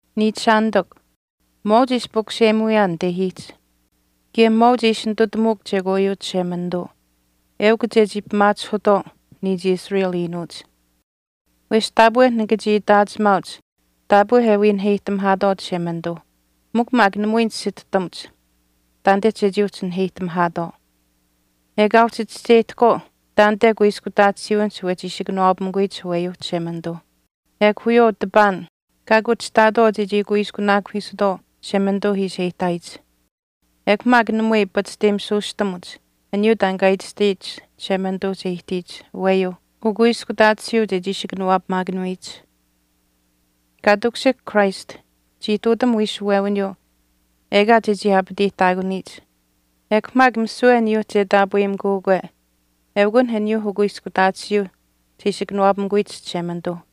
Niichishaanitikw, mwaauch e ishi pukuseyimuyaan nitehiich kaye mwaauch e ishi nitutamuuk chekwaayuu Chishemanituu eukw chechii pimaachihutwaau niich Israel iinuuch. Wesh taapwe nika chii itaachimaauch taapwe e wii naheyihtamihaatwaau Chishemanituuh mikw maak namui nisituhtamuch taanite chechii uhchi naheyihtamihaatwaau. Ekaa uhchi chischeyihtahkwaau taanite kuiskutaatisiiwinihch wechi ishi kanawaapamikuyich aweyuuh Chishemanituuh ekw wiyawaau tipaan kaa kuchihtaatwaau chechii kuiskunaakuhiisutwaau Chishemanituu ishi e ihtaayich. Ekw maak namui pachishteyimitisuustamuch aniyuu taan kaa itashtaayich Chishemanituuh che ihtiyich aweyuuh ukuiskutaatisiiu chechii ishi kanawaapamaakanuyich. Kaa takushihk Christ chii ihtuutam wiishuwewiniyuu ekaa chechii aapateyihtaakuniyich, ekw maak misiwe aniyuuh che taapweyimikuukwe eukunh aniyuuh ukuiskutaatisiiuh che ishi kanawaapamikuyich Chishemanituuh.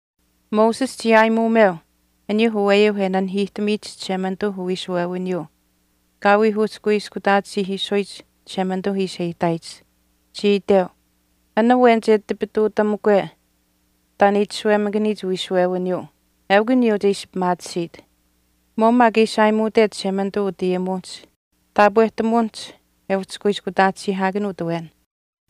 Moses chii aayimuumeu aniyuuh aweyuu e nanihiihtamiyich Chishemanituuh uwiishuwewiniyuu kaa wii uhchi kuiskutaatisiihiisuyich Chishemanituu ishi e ihtaayich. Chii iteu, “An awen che tipituutamukwe taan e itashuwemakaniyich wiishuwewiniyuu eukw aniyuu che ishi pimaatisiit.” Mwaau maak e ishi aayimuutech Chishemanituu utayimuwinihch taapwehtamuwinihch e uhchi kuiskutaatisiihaakanuut awen,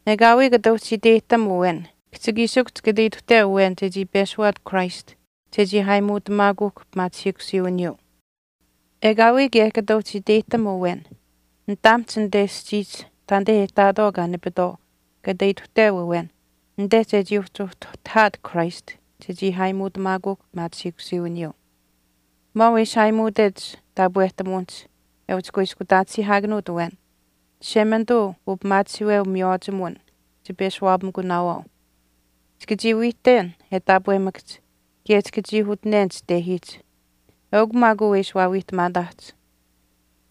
ekaawii kata uhchi iteyihtam awen kihchikiishikuhch kata ituhteu awen chechii peshuwaat Christ chechii aayimuutamaakuuhkw pimaachihiikusiiwiniyuu. Ekaawii kaye kata uhchi iteyihtam awen nitaamihch anite aschiihch taanite e ihtaatwaau kaa nipitwaau kata ituhteu awen anite chechii uhtuhtahaat Christ chechii aayimuutamaakuuhkw pimaachihiikusiiwiniyuu. Mwaau e ishi aayimuutech taapwehtamuwinihch e uhchi kuiskutaatisiihaakanuut awen, Chishemanituu upimaachihiiweu miywaachimuwin chipeshuwaapamikunaawaau. Chika chii wiihten e taapwemakahch kaye chika chii utinen chitehiihch. Eukw maak uu e ishi waawiihtamaahch.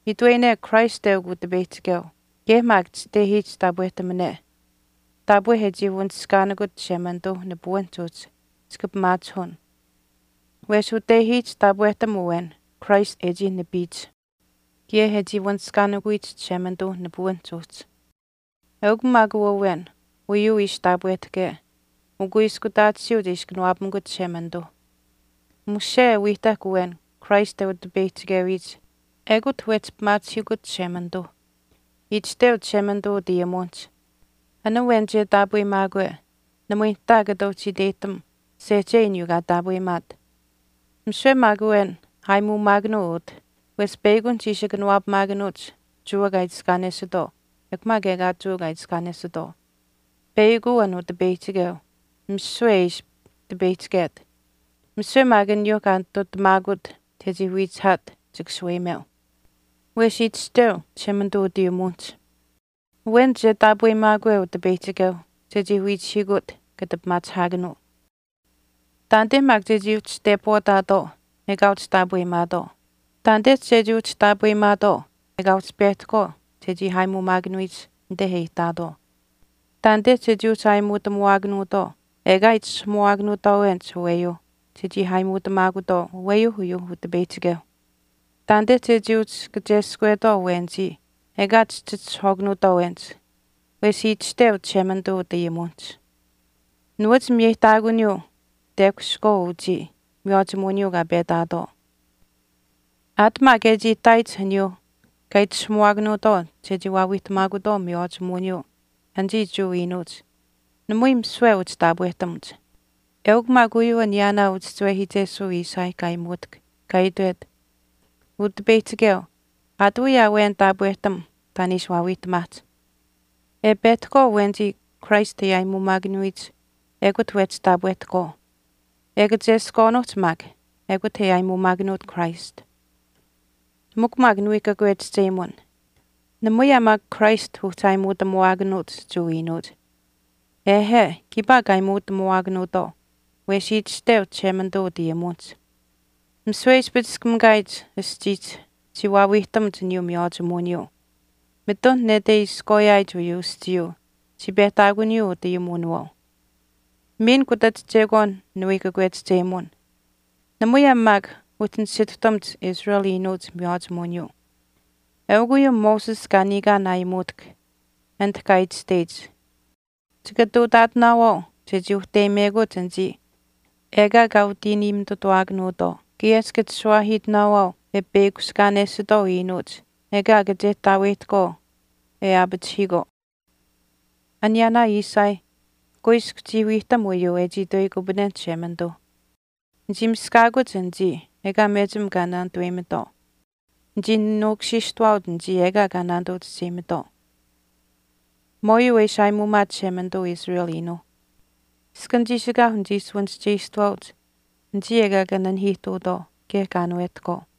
Itweyine Christ eukw Utipeyihchikeu kaye maak chitehiihch taapwehtamane taapwe e chii wanishkaanikut Chishemanituuh nipuwinihch uhchi chika pimaachihun. Wesh utehiich taapwehtam awen Christ e chii nipiyich kaye e chii wanishkaanikuyich Chishemanituuh nipuwiniihch uhchi. Eukw maak uu awen uyuu ishi taapwehtahke ukuiskutaatisiiu che ishi kanawaapamikut Chishemanituuh. Mushe e wiihtahk awen Christ e utipeyihchikewiyich ekut wehchi pimaachihiikut Chishemanituuh. Itashteu Chishemanituu utayimuwinihch, “An awen che taapweyimaakwe namui nihtaa kata uhchi iteyihtam sehchei aniyuu kaa taapweyimaat.” Misiwe maak awen aayimuumaakanuu utah wesh peyakunihch ishi kanawaapamaakanuuch Jewa kaa itiskaanesitwaau ekw maak ekaa Jewa kaa itiskaanesitwaau. Peyakuu an Utipeyihchikeu misiwe e ishi tipeyihchiket. Misiwe maak aniyuuh kaa nitutamaakut chechii wiichihaat chika shaweyimeu. Wesh itashteu Chishemanituu utayimuwinihch, “Awen che tepwaataakwe Utipeyihchikeuh chechii wiichihiikut kata pimaachihaakanuu.” Taanite maak chechii uhchi tepwaataatwaau ekaa uhchi taapweyimaatwaau. Taanite chechii uhchi taapweyimaatwaau ekaa uhchi pehtahkwaau chechii aayimuumaakanuyich anite e ihtaatwaau. Taanite chechii uhchi aayimuutamuwaakanuutwaau ekaa itishahamuwaakanuutwaawenich aweyuuh chechii aayimuutamaakutwaau aweyuu uyuu Utipeyihchikeuh. Taanite chechii uhchi kacheskwetwaau awenichii ekaa chihchitishahwaakanuutwaawenich. Wesh itashteu Chishemanituu utayimuwinihch, Nuwach miyeyihtaakuniyuu tekushihkwaauh uchii miywaachimuwiniyuu kaa petaatwaau. Aat maak e chii ihtaayich aniyuuh kaa itishahamuwaakanuutwaau chechii waawiihtamaakutwaau miywaachimuwiniyuu anichii Jewa iinuuch namui misiwe uhchi taapwehtamuch. Eukw maak uyuu aniyaanaa uchischiwehiichesuu Isaiah kaa aayimuutahk kaa itwet, Utipeyihchikeu, aatawii aa awen taapwehtam taan e ishi waawiihtamaahch. E pehtahkwaau awenichii Christ e aayimuumaakanuyich ekut wehchi taapwehtahkwaau. E kacheskwaanuuhch maak ekut e aayimuumaakanuut Christ. Mikw maak niwii kakwechihchemun, namui aa maak Christ uhchi aayimuutamuwaakanuuch Jewa iinuuch. Ehe, kiipaa kaa aayimuutamuwaakanuutwaau. Wesh itashteu Chishemanituu utayimuwinihch, Misiwe e ispichiskamikaayich aschiihch chii waawiihtamuch aniyuu miywaachimuwiniyuu. Mitun nete e iskwaayaayich uyuu aschiiyuu chii pehtaakuniyuu utayimuwinawaau. Miin kutach chekwaan niwii kakwechihchemun, namui aa maak uhchi nisituhtamuch Israel iinuuch miywaachimuwiniyuu. Eukw uyuu Moses kaa niikaan aayimuutahk anit kaa itashteyich, Chika ihtuutaatinaawaau chechii uhteyimekuch anichii ekaa kaa utiiniimitutuwaakanuutwaau, kaye chika chishuwaahiitinaawaau e peyakushkaanesitwaau iinuuch ekaa kachehtaaweyihtahkwaau e aapachihiikwaau. Aniyaanaa Isaiah kuiskw chii wiihtam uyuu e chii itweyikupanenh Chishemanituu, Nichii miskaakuch anichii ekaa mechim kaa naanituweyimitwaau. Nichii nuukushiishtawaauch anichii ekaa kaa naanituu chischeyimitwaau. Mwaauyuu e ishi aayimuumaat Chishemanituu Israel iinuuh, Iskan chiishikaauh nichii shuwanischeyishtuwaauch anichii ekaa kaa nanihiihtuutwaau kaye kaa aanuwehtahkwaau.